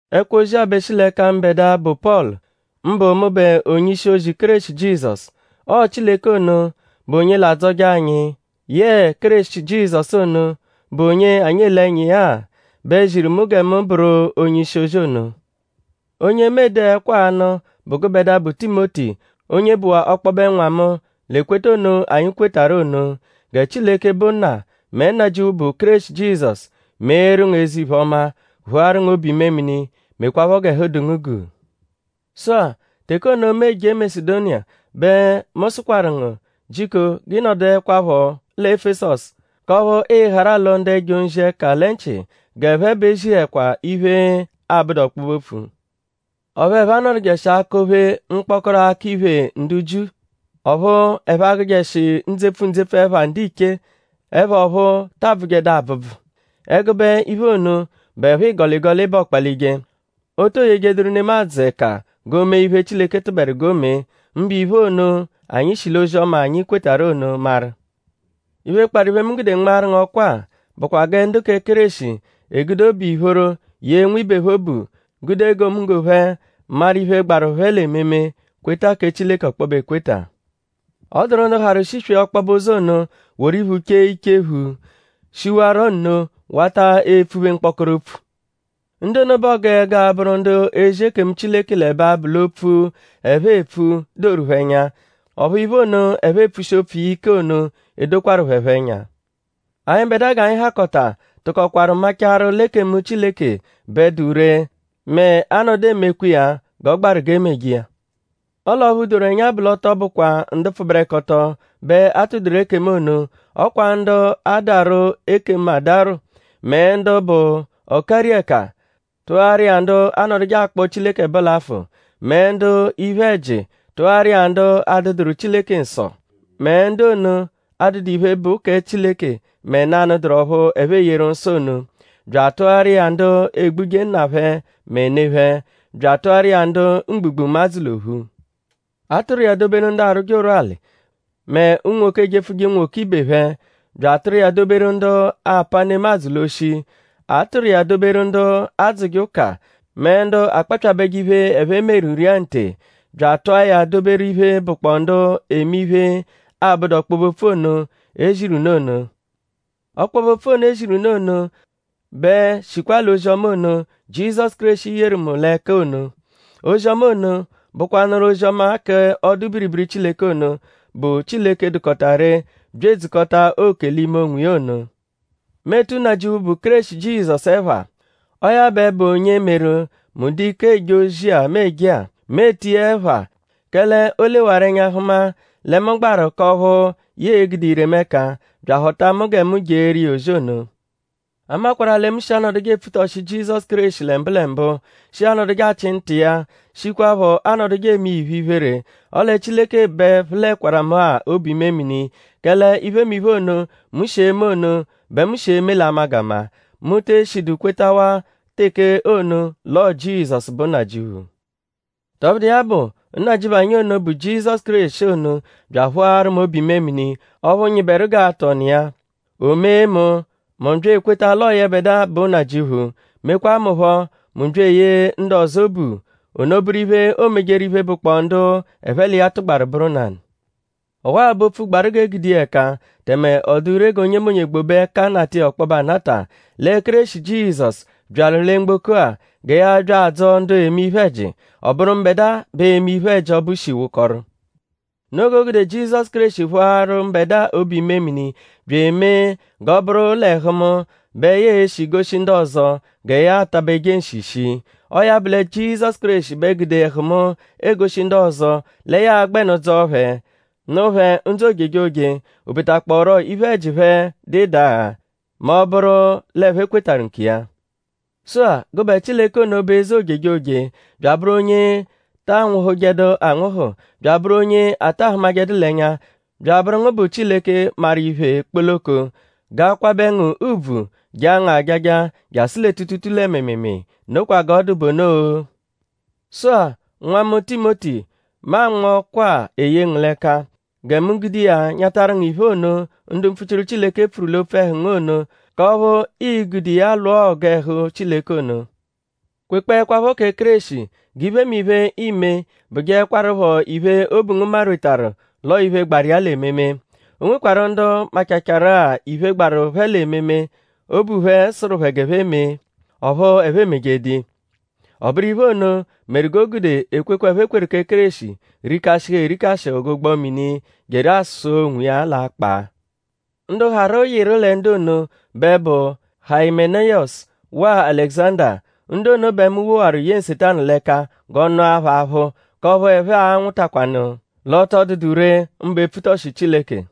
Ẹkwo-ozi-a bẹ shi l'ẹka mbẹdua, bụ Pọlu; mbụ mụbe onye-ishi-ozi Kéreshi Jizọsu. Ọo Chileke ono, bụ onye l'adzọje anyi; yẹe Kéreshi Jizọsu ono, bụ onye anyi ele ẹnya iya-a; bẹ ziru mu gẹ mu bụru onye-ishi-ozi ono. Onye mu ede ẹkwo-a anụ bụ gụbedua, bụ Timoti; onye bụwaa ọkpobe nwa mu; l'ekweta ono anyi kwetarụ ono. Gẹ Chileke, bụ Nna; mẹ Nnajịuphu, bụ Kéreshi Jizọsu; meeru ngu eze-iphe-ọma; phụaru ngu obu-imemini; mekwaphọ g'ẹhu dụ ngu guu. Sụ-a; teke ono, mu eje Masedoniya bẹ mu sụkwaru ngu: jiko g'ị nọduekwapho lẹ Efesọsu k'ọphu ịi-harụ alọ ndu ẹjo-nzi ẹka lẹ nchị g'ẹphe b'e ezihẹkwa iphe, abụdu ọkpobe-opfu. Ọphu ẹphe anọdujeshi akọ-phe mkpọkoro akọ-iphè ndu Jiu. Ọphu ẹphe agụshijeshi ndzepfu ndzepfu ẹpha ndiche; ẹpha ọphu ta abvụjedu abvụbvu. Ẹgube iphe ono bụepho ịgoligoli bẹ ọokpa-lije. O to yejeduru nemadzụ ẹka g'o mee iphe, Chileke tụberu g'o mee; mbụ iphe ono, anyi shi l'ozi-ọma, anyi kwetarụ ono maru. Iphe, kparụ iphe, mu gude nmaaru ngu ọkwa-a bụkwa gẹ ndu kẹ Kéreshi egude obu ìphóró yee nwibe phẹ obu; gude egomunggo phẹ maru iphe, gbaru phẹ l'ememe; kweta kẹ Chileke ọkpobe ekweta. Ọ dụru ndu hawaru shiswee ọkpobe ụzo ono; woru iphu chee ichephu; shiwarọ nno wata epfuphe mkpọkoro opfu. Ndu ono bẹ ọogu ẹgu abụru ndu ezi ekemu Chileke l'ẹbe abụ l'opfu, ẹphe epfu doru phẹ ẹnya; ọphu iphe ono, ẹphe epfushi opfu iya ike ono edokwaru phẹ phọ ẹnya. Anyịbedua g'anyi hakọta bẹ tụkokwaru machaarụ l'ekemu Chileke bẹ dụ ree mẹ a -nọdu emekwa iya g'ọ gbaru g'e meje iya. Ọle ọphu doru ẹnya bụ l'ọ tọ bụkwa ndu pfụberekoto bẹ a tụ-doru ekemu ono. Ọ kwa ndu adarwụ ekemu adarwụ; mẹ ndu bụ ọ-kari-ẹka; tụaru iya ndu anọduje akpọ Chileke ẹbo l'afụ; mẹ ndu iphe-ẹji; tụaru iya ndu adụduru Chileke nsọ; mẹ ndu ono adụdu iphe, bụ kẹ Chileke mẹ nanụ dụru ọphu ẹphe eyeru nsọ ono; bya atụaru iya ndu egbuje nna phẹ mẹ ne phẹ; bya atụaru iya ndu mgbugbụmadzu l'ophu. A tụru iya doberu ndu arwụje ụrwuali; mẹ unwoke ejepfuje unwoke ibe phẹ; bya atụa ya doberu ndu apa nemadzụ l'oshi. A tụru iya doberu ndu adzụje ụka mẹ ndu akpapyabẹje iphe, ẹphe meru ria nte; bya atụa ya doberu iphe, bụkpoo ndu eme iphe, abụdu ọkpobe-opfu ono, e ziru unu ono. Ọkpobe-opfu ono, e ziru unu ono bẹ shikwa l'ozi-ọma ono, Jizọsu Kéreshi yeru mu l'ẹka ono. Ozi-ọma ono bụkwanuru ozi-ọma k'ọdu-biribiri Chileke ono, bụ Chileke dụkota ree bya edzukọta oke l'ime onwiya ono. Mu etu Nnajịuphu, bụ Kéreshi Jizọsu ẹpha. Ọo ya bẹ bụ onye meru; mu dụ ike eje ozi-a, mu eje-a. Mu etu iya ẹpha; kẹle o lewaru ẹnya hụma lẹ mu gbaru k'ọphu ya e-gude ire mu ẹka; bya ahọta mu gẹ mu jeeru iya ozi ono. A makwarụ-a lẹ mu shi anọduje epfutọshi Jizọsu Kéreshi lẹ mbụlembu; shi anọduje achị nta iya; shikwaphọ anọduje eme iya iphe-iphere. Ọle Chileke bẹ phụlekwaru mu-a obu-imemini; kẹle iphemiphe ono, mu shi eme ono bẹ mu shi eme l'amagama. Mu te eshidu kwetawaa teke ono l'ọo Jizọsu bụ Nnajịuphu. Tọbudu iya bụ; Nnajịuphu anyi ono, bụ Jizọsu Kéreshi ono bya aphụaru mu obu-imemini ọphu nyịberu g'aatụ ọnu iya. O mee mu: mu bya ekweta l'ọo yẹbedua bụ Nnajịuphu; mekwaa mu phọ: mu bya eyee ndu ọzo obu. Ono bụru iphe, oomejeru iphe, bụkpoo ndu ẹphe l'iya tụgbaru bụru nanụ. Ọwa-a bụ opfu, gbaru g'e gude iya ẹka; tẹme ọ dụ ree g'onyemonye gbobe ẹka nata iya ọkpobe anata. Lẹ Kéreshi Jizọsu byaru lẹ mgboko-a gẹ ya bya adzọo ndu eme iphe-ẹji. Ọ bụru mbẹdua bẹ eme iphe-ẹji ọbu shi wụkoru. Noo g'o gude Jizọsu Kéreshi phụaru mbẹdua obu-imemini bya emee g'ọ bụru l'ẹhu mu bẹ ya e-shi goshi ndu ọzo gẹ ya atabeje nshi shii. Ọo ya bụ lẹ Jizọsu Kéreshi bẹ gude ẹhu mu egoshi ndu ọzo lẹ ya a-gbẹnu dzọo phẹ; nụ phẹ ndzụ ojejoje; o betakpọoru iphe-ẹji phẹ dụ ịdagha; mẹ ọ -bụru l'ẹphe kwetarụ nkiya. Sụ-a; gụbe Chileke ono, bụ eze ojejoje; bya abụru onye ta anwụhujedu anwụhu; bya abụru onye ata hụmajedu l'ẹnya; bya abụru ngu bụ Chileke, maru iphe kpoloko; g'a kwabẹ ngu ùbvù; jaa ngu ajaja; jasụ lẹ tuutuutuu lẹ mịimiimii. Nokwa g'ọ dụ bụ ono-o. Sụ-a; nwa mu Timoti; mu anma ọkwa-a eye ngu l'ẹka. Gẹ mu gude iya nyatarụ ngu iphe, ono ndu mpfuchiru Chileke pfuru l'opfu ẹhu ngu ono; k'ọphu ii-gude iya lwụa ọgu ẹhu Chileke ono. Kwekpọekwapho kẹ Kéreshi; g'iphemiphe, iime bụjeekwarupho iphe, obu ngu marwetaru l'ọo iphe, gbaru iya l'ememe. O nwekwarụ ndu machacharu-a iphe, gbaru phẹ l'ememe, obu phẹ sụru g'ẹphe mee; ọphu ẹphe emejedu iya. Ọ bụru iphe ono meru g'o gude ekwekwe, ẹphe kweru kẹ Kéreshi rikashịhu erikashịhu g'ụgbo-mini, jeru asụa onwiya l'akpaa. Ndu harụ yịru lẹ ndu ono bẹ bụ Hayimeniyọsu waa Alẹguzanda. Ndu ono bẹ mu woakwaru ye Nsetanu l'ẹka g'ọ nụa phẹ aphụ k'ọphu ẹphe a-nwụtakwanu l'ọ tọ dụdu ree mbụ epfutọshi Chileke.